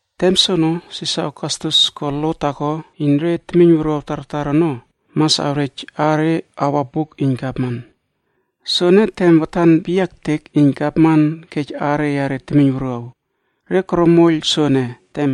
Tem soono Sisar Ogastus ko lo taako iyn re temiyn wuruaw tartar ono mas awrej aare awa buk iyn gavman. Soene tem watan peyia ektek iyn gavman kej aare yare temiyn wuruaw. Re koro moiyl soene,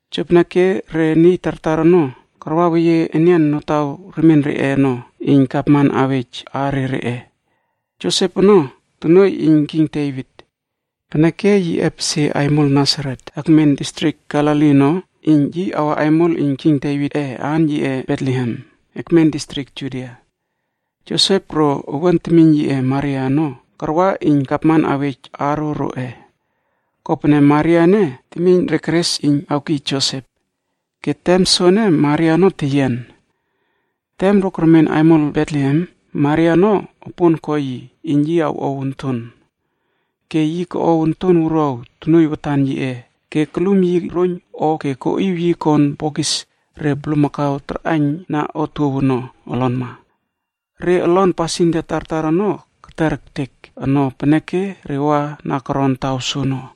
Jopeneke re niy tartar ono karwaweyie enian notaw remien reꞌe ono iyn Gavman awej aare reꞌe. Josep ono, tonuoiy iyn King Devit. Peneke yi epesie aimol Nasaret akmen distrik Galili ono iyn yi awa aimol iyn King Devitꞌe aan yiꞌe Betlehem, ekmen distrik Judia. Josep ro owuan temiyn yiꞌe Maria ono karwa iyn gavman awej aaro roꞌe. Kopene Maria ene temiyn re keres iyn awkiy Josep. Ke tem soene Maria ono teyian. Tem ro kermen aimol Betlehem, Maria ono opon ko yi iyn yi awꞌow onton. Ke yi koꞌow onton wuruaw tonuoiy watan yiꞌe ke kulum yi roiyn o ke koꞌiw yi kon bokis re bulmakau tarꞌaiyna otuow ono, olonma. Re olon pasindia tartar ono kerter ektek ono peneke re wa na koron taw soono.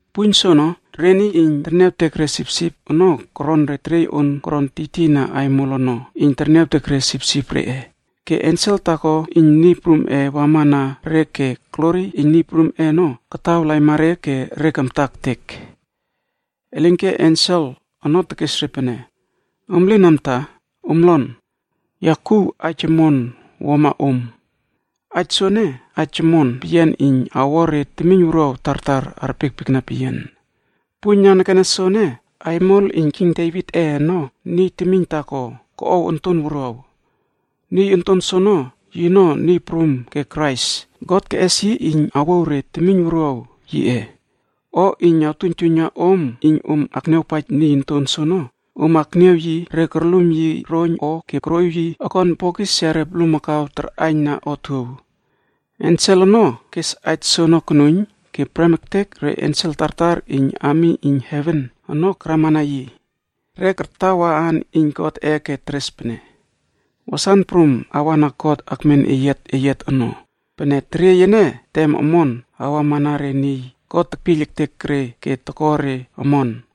Puiyn soono, re niy iyn terniawtek re sipsip ono koron re teriey on koron tiytiyna aimol ono iyn terniawtek re sipsip reꞌe. Ke ensel taako iyn Niy Prumꞌe wamana re ke glori iyn Niy Prumꞌe ono kataw laima re ke re kamta ektek. Elinke ensel ono tekes re pene, “Om lin amta, om lon! Ya kuw aij omon wuama om. Aij soene, aij omon peyian iyn awo re temiyn wuruaw tartar arpiekpiekna peyian. Puiyn nanekene soene, aimol iyn King Devitꞌe ono niy temiyn taako koꞌow onton wuruaw. Niy onton soono, yino Niy Prum ke Krais God keꞌes iyn awouw re temiyn wuruaw yiꞌe. O iyn awtuiyntuiyna om iyn om akniawpaij niy onton soono, om akniaw yi re korlum yi roiyn o ke koroꞌiw yi okon bokis yare bulmakau tarꞌaiyn na otuow.” Ensel ono kes aij soono konuiyn, ke prem ektek re ensel tartar iyn ami iyn heven ono karamana yi. Re kartawa aan iyn Godꞌe ke teres pene: “Wasan prum awa na God akmen eyiat eyiat ono, pene teriey ene tem omon awamana re niy God tekpiyl ektek re ke toko re omon.”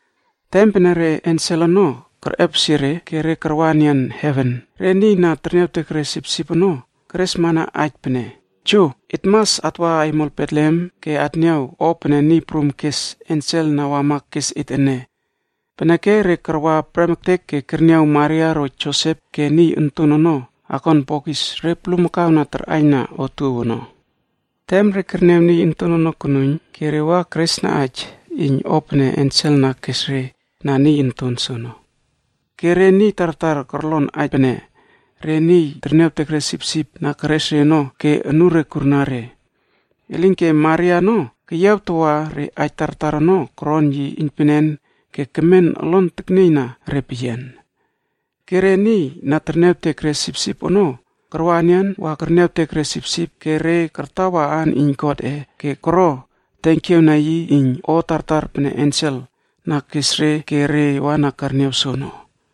Tem pene re ensel ono kerꞌepesie re ke re karwa enian heven, re niy na terniawtek re sipsip ono keresmana aij pene, “Jo, et mas atwa aimol Betlehem ke atniaw o pene Niy Prum kes ensel na wama kes et ene.” Peneke re karwa prem ektek ke kerniaw Maria ro Josep ke niy onton ono akon bokis re bulmakau na tarꞌaiyna otuow ono. Tem re kerniaw niy onton ono konuiyn ke re wa keresna aij iyn o pene ensel na kes re, na niy onton soono. Ke re niy tartar korlon aij pene re niy terniawtek re sipsip na keres ono ke anure kurna re. Elinke Maria ono keyiawtawa re aij tartar ono koron yi iynpenen ke kemen olon teknieyna re peyian. Ke re niy na terniawtek re sipsip ono karwa enian wa kerniawtek re sipsip ke re kartawa aan iyn Godꞌe ke koro tenkiaw na yi iyn o tartar pene ensel na kes re ke re wa na kerniaw soono.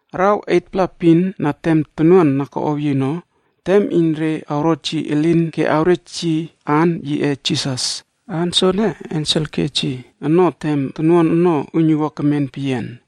Araw 8-pla epin na tem tonuan na koꞌow yi ono, tem iyn re awrot yi elin ke awrej yi aan yiꞌe Jisas. Aan soene ensel kej yi ono tem tonuan ono uiynuwua kemen peyian.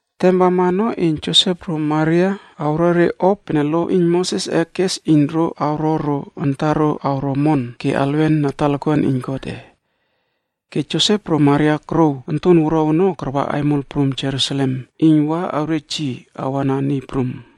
Tem wama ono iyn Josep ro Maria awro re o pene lo iyn Mosesꞌe kes iyn ro awro ro antaro alwen na talakuan iyn Godꞌe. Ke Josep ro Maria korouw onton wuruaw ono karwa aimol prum Jerusalemb iyn wa awrej yi awa Niy Prum.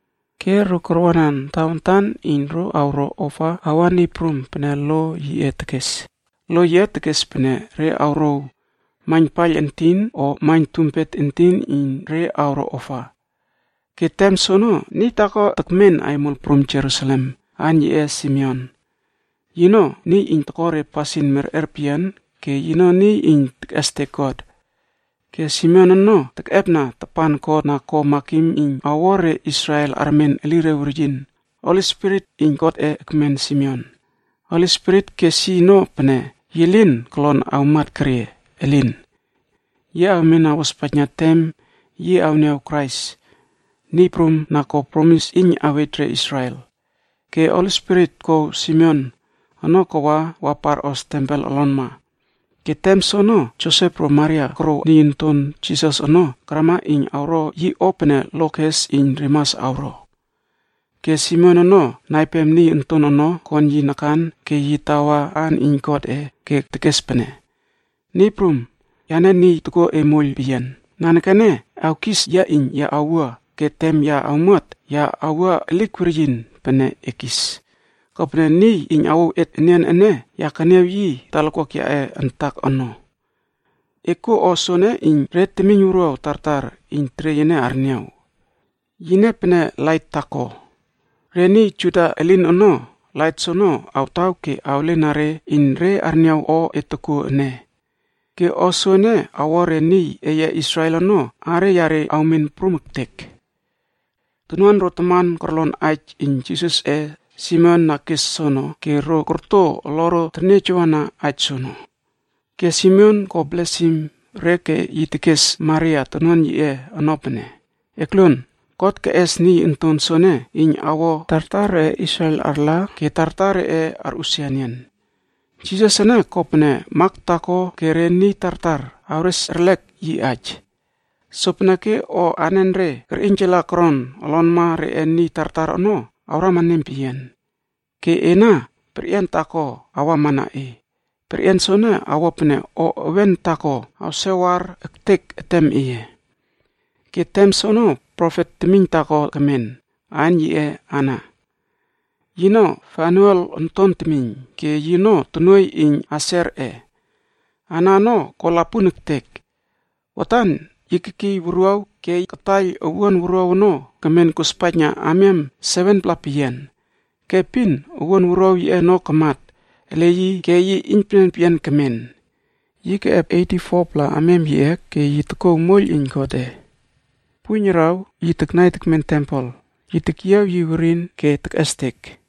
Ke ro karwanan tawantan iyn ro awro ofa awa Niy Prum pene lo yiꞌe tekes. Lo yiꞌe tekes pene re awrouw, “Maiyn paiyl entin o maiyn tumpet entin iyn re awro ofa.” Ke tem soono niy taako tekmen aimol prum Jerusalem, aan yiꞌe Simeon. Yino niy iyn toko re pasin merꞌer peyian ke yino niy iyn tekꞌestek God. Ke Simeon ono tekꞌepna tapan God na ko makim iyn awo re Israel armen elire weryin. Holi Spirit iyn Godꞌe ekmen Simeon. Holi Spirit kes yi ono pene yi lin kolon awmat kerie, Elin! Yi awmen awospaijna tem yi awniaw Krais, Niy Prum na ko promis iyn awej re Israel. Ke Holi Spirit kouw Simeon ono kawa wa parꞌos tempel olonma. Ke tem soono Josep ro Maria korouw niy onton Jisas ono karama iyn awro yi o pene Lo kes iyn re mas awro. Ke Simeon ono naipem niy onton ono kon yi nakan ke yi tawa aan iyn Godꞌe ke tekes pene: “Niy Prum, yane niy tokuo e moiyl peyian, nanekene awkis yia iyn ya awua ke tem ya awmuat, ya awua elik weryin pene e kis. Kopene niy iyn awouw et enian ene, ya keniaw yi talakuak yaꞌe antak ono. E kuo o soene iyn re temiyn wuruaw tartar iyn teriey ene arniaw. Yine pene lait taako. Re niy Juda elin ono, lait soono awtaw ke awlena re iyn re arniaw o e tokuo ene. Ke o soene awo re niy eye Israel ono aare yare awmen prum ektek.” Tonuan ro taman korlon aij iyn Jisasꞌe Simeon na kes soono ke ro korto oloro terniejawana aij soono. Ke Simeon ko blesim re ke yi tekes Maria tonuan yiꞌe ono pene, “Ekluon! God keꞌes niy onton soene iyn awo tartar reꞌe Israel arla ke tartar reꞌe arꞌusia enian. Jisas ene kopene mak taako ke re niy tartar awres erlek yi aij. Sopeneke o anenre kerꞌiynjala koron olonma reꞌe niy tartar ono awrama nempeyian. Ke ena, perꞌian taako awamana e. Perꞌian soene awo pene o ewen taako awsewar ektek etem eye.” Ke tem soono profet temiyn taako kemen, aan yiꞌe Ana. Yino Fanuel onton temiyn ke yino tonuoiy iyn Aserꞌe. Ana ono ko lapun ektek. Watan yi kekiy wuruaw ke kataiyl owuan wuruaw ono kemen kospaijna amiam 7-pla peyian. Ke epin owuan wuruaw yiꞌe ono kamat ele yi ke yi iynpenen peyian kemen. Yi keꞌep 84-pla amiam yiꞌe ke yi tokouw moiyl iyn Godꞌe. Puiyn araw yi taknai tekmen tempel, yi tekyiaw yi werin ke tekꞌestek.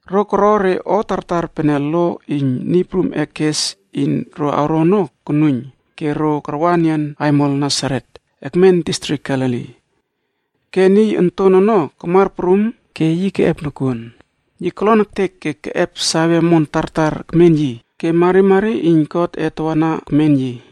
Ro koro re o tartar pene Lo iyn Niy Prumꞌe kes iyn ro awro ono konuiyn ke ro karwa enian aimol Nasaret, ekmen distrik Galili. Ke niy onton ono kamar prum ke yi keꞌep nokuon. Yi kolon ektek ke keꞌep save omon tartar ekmen yi ke marimari iyn Godꞌe tawana ekmen yi.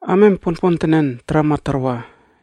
Amiam ponpontenen tarama tarwa,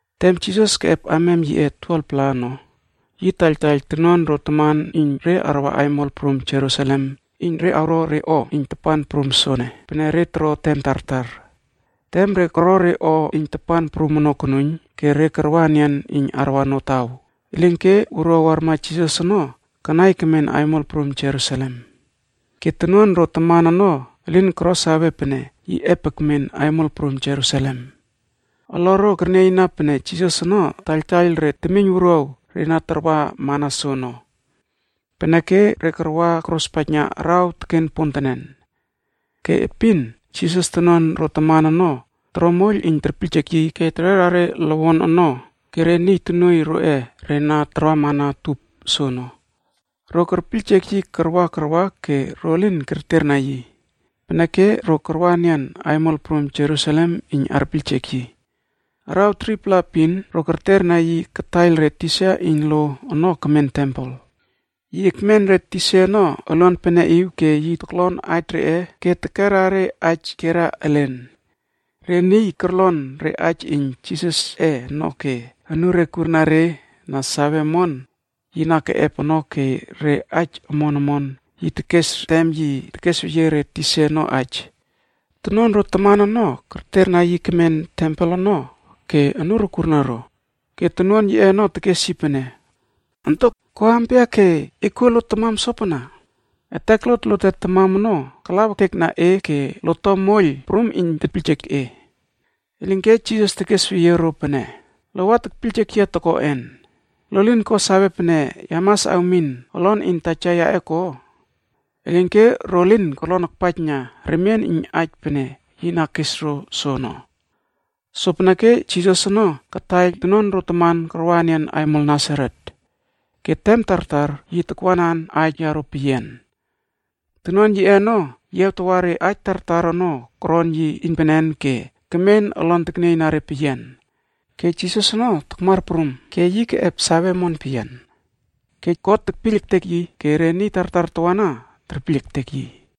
Tem Jisas keꞌep amiam yiꞌe 12-pla ono, yi taiyltaiyl tonuan ro taman iyn re arwa aimol prum Jerusalem iyn re awro re o iyn tapan prum soene, pene re toro tem tartar. Tem re koro re o iyn tapan prum ono konuiyn, ke re karwa enian iyn arwa notaw. Elinke wuruaw warma Jisas ono kanai kemen aimol prum Jerusalem. Ke tonuan ro taman ono elin koro save pene yi ep ekmen aimol prum Jerusalem. Oloro kernieyna pene Jisas ono taiyltaiyl re temiyn wuruaw re na tarwa mana soono. Peneke ro karwa kospaijna araw teken pontenen. Ke epin Jisas tonuan ro taman ono toro moiyl iyn terpiyljek yi ke tererna re lowon ono ke re niy tonuoiy roꞌe re na tarwamana utup soono. Ro kerpiyljek yi karwa karwa ke ro lin kerterna yi. Peneke ro karwa enian aimol prum Jerusalem iyn arpiyljek yi. Araw 3-pla epin ro kerterna yi kataiyl re tisa iyn lo ono kemen tempel. Yi ekmen re tisa ono oluan peneꞌiw ke yi toklon aij reꞌe ke tekerna re aij kierna elen. Re niy korlon re aij iyn Jisasꞌe ono anure kurna re na sawe omon yi na keꞌep ono ke re aij omon omon yi tekes tem yi tekesweyie re tisa ono aij. Tonuan ro taman ono kerterna yi kemen tempel ono ke anuro kurna ro. Ke tonuan yiꞌe ono tekes yi pene, “Ontok! Ko ampia ke e kuo lot tamam sopana? Etek lote tamam ono kalaw ektek na e ke lot to moiyl prum iyn tepiyljek e.” Elinke Jisas tekesweyie ro pene, “Lo wa tekpiyljek yia tokoꞌen? Lo lin ko save pene ya mas awmin olon iyn Taja yaꞌe ko?” Elinke ro lin korlon akpaijna remien iyn aij pene yi na kes ro soono. Sopeneke Jisas ono kataiyl tonuan ro taman karwa enian aimol Nasaret. Ke tem tartar yi takwanan aij yaro peyian. Tonuan yiꞌe ono yiawtawa re aij tartar ono koron yi iynpenen ke kemen olon teknieyna re peyian. Ke Jisas ono takmar prum ke keꞌep save omon peyian. Ke God ke re niy lamat ene kerpiekpiekna ke kerpiyl ektekma yi peyian.